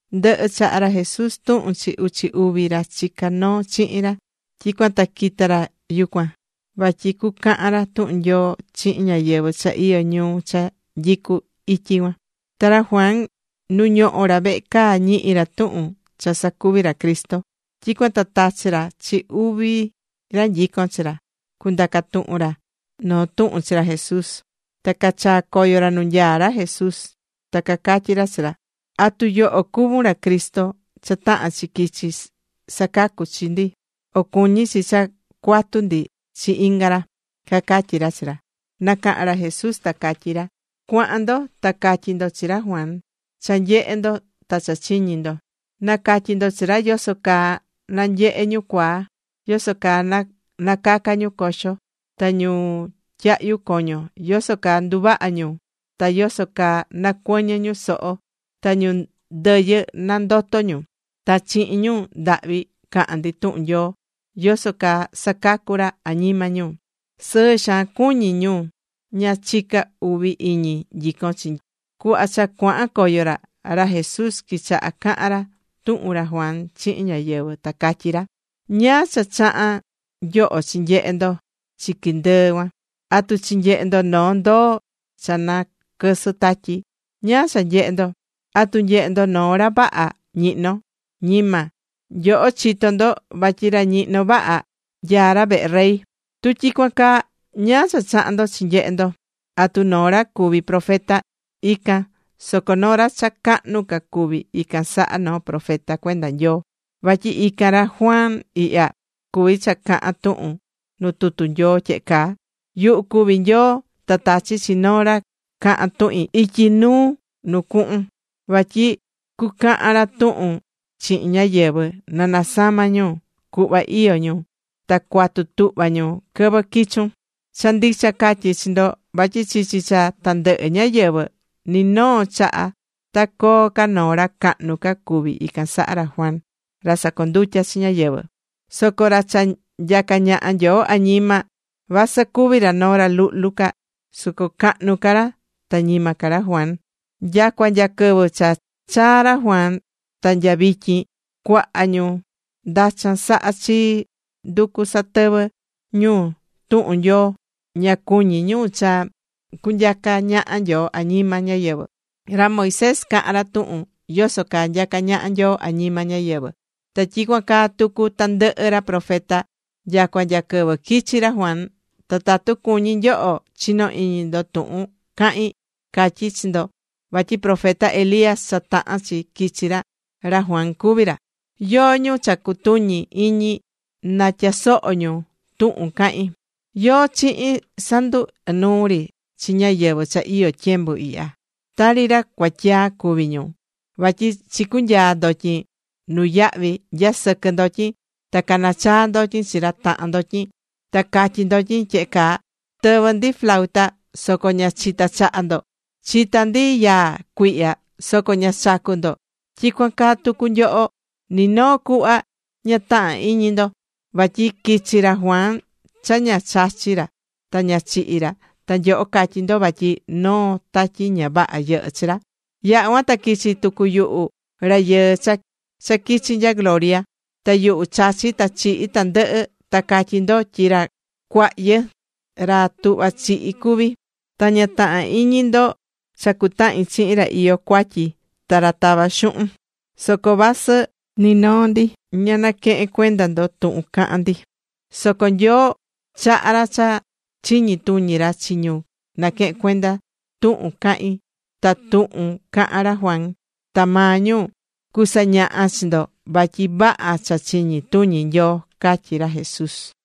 Ndɨhɨ̱ chaha̱ ra Jesús tuhun chi uchi uvi ra chicá noo chihin ra, tyicuan ta quita̱ ra yucuan, vatyi cucahan ra tuhun Nyoo chihin ñáyɨvɨ cha iyó ñuu cha nyicú ityi cuan. Ta ra Juan nu ñohó ra vehe caa, ñihi̱ ra tuhun cha sacuví ra Cristo. Tyicuan ta tachi̱ ra chi uvi ra nyicón chi ra, cundaca tuhun ra noo tuhun chi ra Jesús. Ta cachaa̱ coyo ra nu nyaá ra ta cacatyí ra chi ra: ―¿Atu yoho cuvún ra Cristo cha tahán chi quichi sacacu chi ndi, o cuñí chi cha cuatu ndi chi inga ra? ―cacatyí ra chi ra. Nacaha̱n ra Jesús ta catyí ra: ―Cua̱han ndo ta ca̱tyi ndo chi ra Juan cha nyehé ndo, ta cha chiñí ndo. Na̱catyi ndo chi ra yoso caa nanyehé ñu cuaa, yoso caa nacacá ñu coxo, ta ñu tyahyu coño yoso caa nduvahá ñu, ta yoso caa nacuɨñɨ ñu soho, ta ñu ndɨyɨ nandoto ñu, ta chihin ñu ndahvi cahán ndi tuhun Nyoo yoso caa sacacu ra añima ñu. ’Sɨɨ xaan cuñí ñu ña chicá uvi iñi nyicón chii. Cuhva cha cuahan coyo ra, ra Jesús quichaha cahan ra tuhun ra Juan chihin ñáyɨvɨ, ta catyí ra: ―¿Ñáá cha chaha̱n nyoho chinyehe ndo chiqui ndɨɨ cuan? ¿Atu chinyehe̱ ndo noo ndoo cha naquɨsɨ́ tatyi? ¿Ñáá cha nyehe̱ ndo? ¿Atu nyehe̱ ndo noo ra vaha ñihnó? Ñima. Nyoho chitó ndo vatyi ra ñihnó vaha, nyaá ra vehe rey. Tu tyicuan caa, ¿ñáá cha chaha̱n ndo chi nyehe ndo? ¿Atu noo ra cuví profeta? Ican. Soco noo ra cha cahnu ca cuví ican saha noo profeta cuenda Nyoo. Vatyi ican ra Juan ihya, cuví cha cahán tuhun nu tutu Nyoo tyehe caa: Yuhu cuví Nyoo ta tachí chi noo ra cahan tuhin ityi nuu nu cuhun. Vatyi cucahan ra tuhun chihin ñáyɨvɨ nanasama ñu cuhva iyo ñu ta cuatu tuhva ñu quɨvɨ quichun. ’Cha ndicha catyí chi ndo, vatyi chichi cha tandɨhɨ ñáyɨvɨ, ni noo chaha ta coo ca noo ra cahnu ca cuví ican saha ra Juan ra sacondutyá chi ñáyɨvɨ. Soco ra cha nyacá ñaha Nyoo añima, vasɨ cuví ra noo ra luhlu ca, soco cahnu ca ra ta ñima ca ra Juan. Nyacua nya quɨvɨ cha chaa̱ ra Juan ta nya vityin, cuaha ñu ndachan sahá chii nducú satɨvɨ ñu tuhun Nyoo, ña cuñí ñu cha cunyacá ñaha Nyoo añima ñáyɨvɨ. Ra Moisés caha̱n ra tuhun yoso caa nyacá ñaha Nyoo añima ñáyɨvɨ, ta tyicuan caa tucu tandɨhɨ ra profeta nyacua nya quɨvɨ quichi̱ ra Juan. Ta tatu cuñí nyoho chino iñi ndo tuhun cahín, catyí chi ndo vatyi profeta Elías cha taha̱n chi quichi, ra Juan cuví ra. Yóó ñu cha cutuñi iñi, na tyasoho ñu tuhun cahín. ’¿Yóó chihin sandu ɨnuu ri chi ñáyɨvɨ cha iyó tyembu ihya? Tari ra cuatyaa cuví ñu, vatyi chicunyaa ndotyin nuyahvi nyasɨquɨ ndotyin, ta canachaa ndotyin chi ra tahan ndotyin, ta catyí ndotyin tyehe caa: “Tɨvɨ̱ ndi flauta, soco ña chita̱ chaha ndo. Chita̱ ndi yaa cuihya soco ña chacu̱ ndo.” Tyicuan caa tucu nyoho, ni noo cuhva ña tahán iñi ndo. Vatyi quichi̱ ra Juan, cha ña chachi̱ ra ta ña chihi̱ ra, ta nyoho catyí ndo vatyi noo tatyi ña vaha yɨhɨ́ chi ra. Yaha̱ cuan ta quichi̱ tucu yuhu Rayɨɨ cha quichi nya gloria. Ta yuhu chachí ta chihí tandɨhɨ, ta catyí ndo tyi ra cuahyɨ ra tuhvá chihi cuví. Ta ña tahán iñi ndo cha cutahín chihin ra iyó cuatyi ta ra tavá xuhun. Soco vasɨ ni noo ndi ña naquehén cuenda ndo tuhun cahán ndi, soco Nyoo chahá ra cha chiñi tuñi ra chi ñu naquehén tuhun cahin ta tuhun caha̱n ra Juan, ta maa ñu cusañaha chi ndo vatyi vaha cha chiñi tuñi Nyoo ―catyí ra Jesús.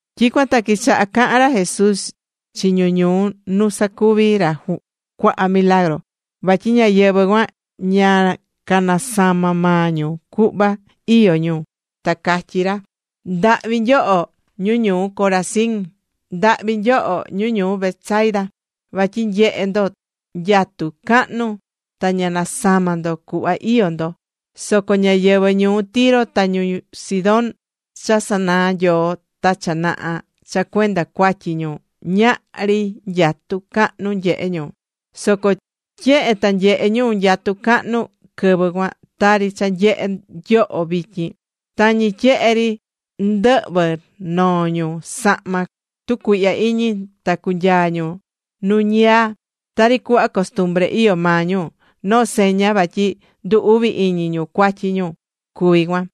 Tyicuan ta quichaha̱ cahan ra Jesús chi ñu ñuu nu sacuvi̱ ra cuaha milagru, vatyi ñáyɨvɨ cuan ña canasama̱ maa ñu cuhva iyó ñu, ta catyí ra: ―¡Ndahvi nyoho, ñu ñuu Corazin! ¡Ndahvi nyoho ñu ñuu Betsaida! Vatyi nyehé ndo nyatu cahnu ta ña nasama̱ ndo cuhva iyó ndo. Soco ñáyɨvɨ ñuu Tiro ta ñuu Sidón cha sanaa̱ Nyoo ta cha naha cha cuenda cuatyi ñu ñahri nyatu cahnu nyehe̱ ñu. Soco tyehe ta nyehe̱ ñu nyatu cahnu quɨvɨ cuan tari cha nyehé nyoho vityin, tañi tyehe ri ndɨhvɨ noo ñu sahma tucuihya iñi ta cunyaa ñu nu ñiyaa. Tari cuhva costumbre iyó maa ñu, noo seña vatyi ndu uvi iñi ñu cuatyi ñu cuví cuan.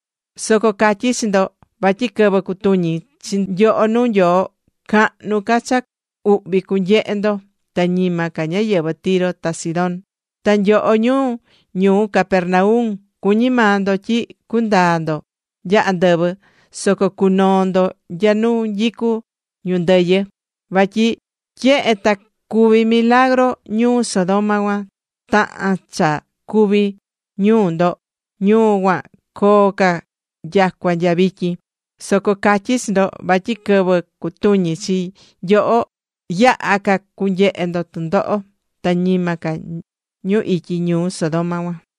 Soco catyí chi ndo vatyi quɨvɨ cutuñi chi nyoho nuu Nyoo, cahnu ca cha uhvi cunyehe ndo ta ñima ca ñáyɨvɨ Tiro ta Sidón. Ta nyoho ñu ñuu Capernaum, cuñí maa ndo tyi cundaa ndo nya andɨvɨ, soco cunoo ndo nya nu nyicú ñu ndɨyɨ. Vatyi tyehe ta cuvi̱ milagru ñuu Sodoma cuan, tahán cha cuvi̱ ñuu ndo, ñuu cuan coo ca nyacua nya vityin. Soco catyí chi ndo vatyi quɨvɨ cutuñi chi nyoho, yaha ca cunyehe ndo tɨndoho, ta ñima ca ñu ityi ñuu Sodoma cuan.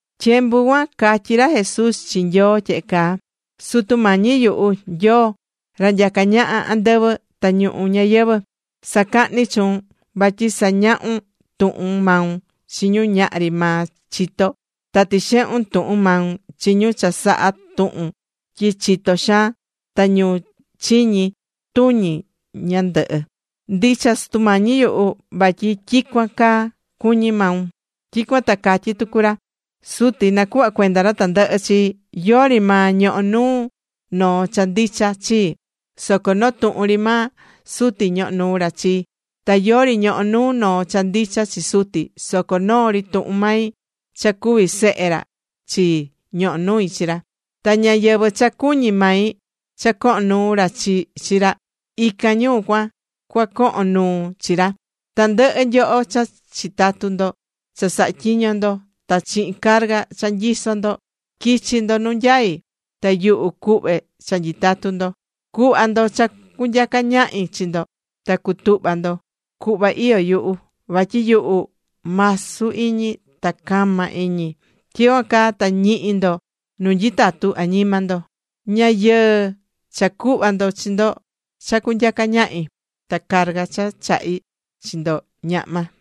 Tyembu cuan catyi ra Jesús chi Nyoo tyehe caa: ―Sutu Mañi yuhu, Nyoo, ra nyacá ñaha andɨvɨ ta ñuhu ñayɨvɨ̱. Sacahní chuun vatyi sañahu̱n tuhun maun chi ñu ñahri maa chitó. Ta tixehu̱n tuhun maun chi ñu cha sahá tuhun tyi chitó xaan ta ñu chiñi tuñi ñandɨhɨ. Ndicha Sutu Mañi yuhu, vatyi tyicuan caa cuñí maun. Tyicuan ta catyí tucu ra: ―Suti nacuhva̱ cuenda ra tandɨhɨ chii. Yori maa ñohó nuu noo cha ndicha chii, soco noo tuhun ri maa Suti ñohó nuu ra chii. Ta yori ñohó nuu noo cha ndicha chi Suti, soco noo tuhun ri mai, cha cuví Sehe ra chii, ñohó nui chi ra. Ta ñáyɨvɨ cha cuñí mai cha cohon nuu chi ra, ican ñu cuan cua cohon nuu chi ra. Tandɨhɨ nyoho cha chitatu ndo cha sahá tyiño ndo, ta chihin carga cha nyisó ndo, qui̱chi ndo nu nyaí, ta yuhu cuhve cha nyitatu ndo. Cu̱hva ndo cha cunyaca ñahi chi ndo ta cu̱tuhva ndo cuhva iyó yuhu. Vatyi yuhu masu iñi ta cama iñi. Tyicuan caa ta ñihi ndo nu nyitatu añima ndo. Ña yɨɨ cha cuhva ndo chi ndo cha cunyaca ñahi. Ta carga cha chahí chi ndo, ñahma.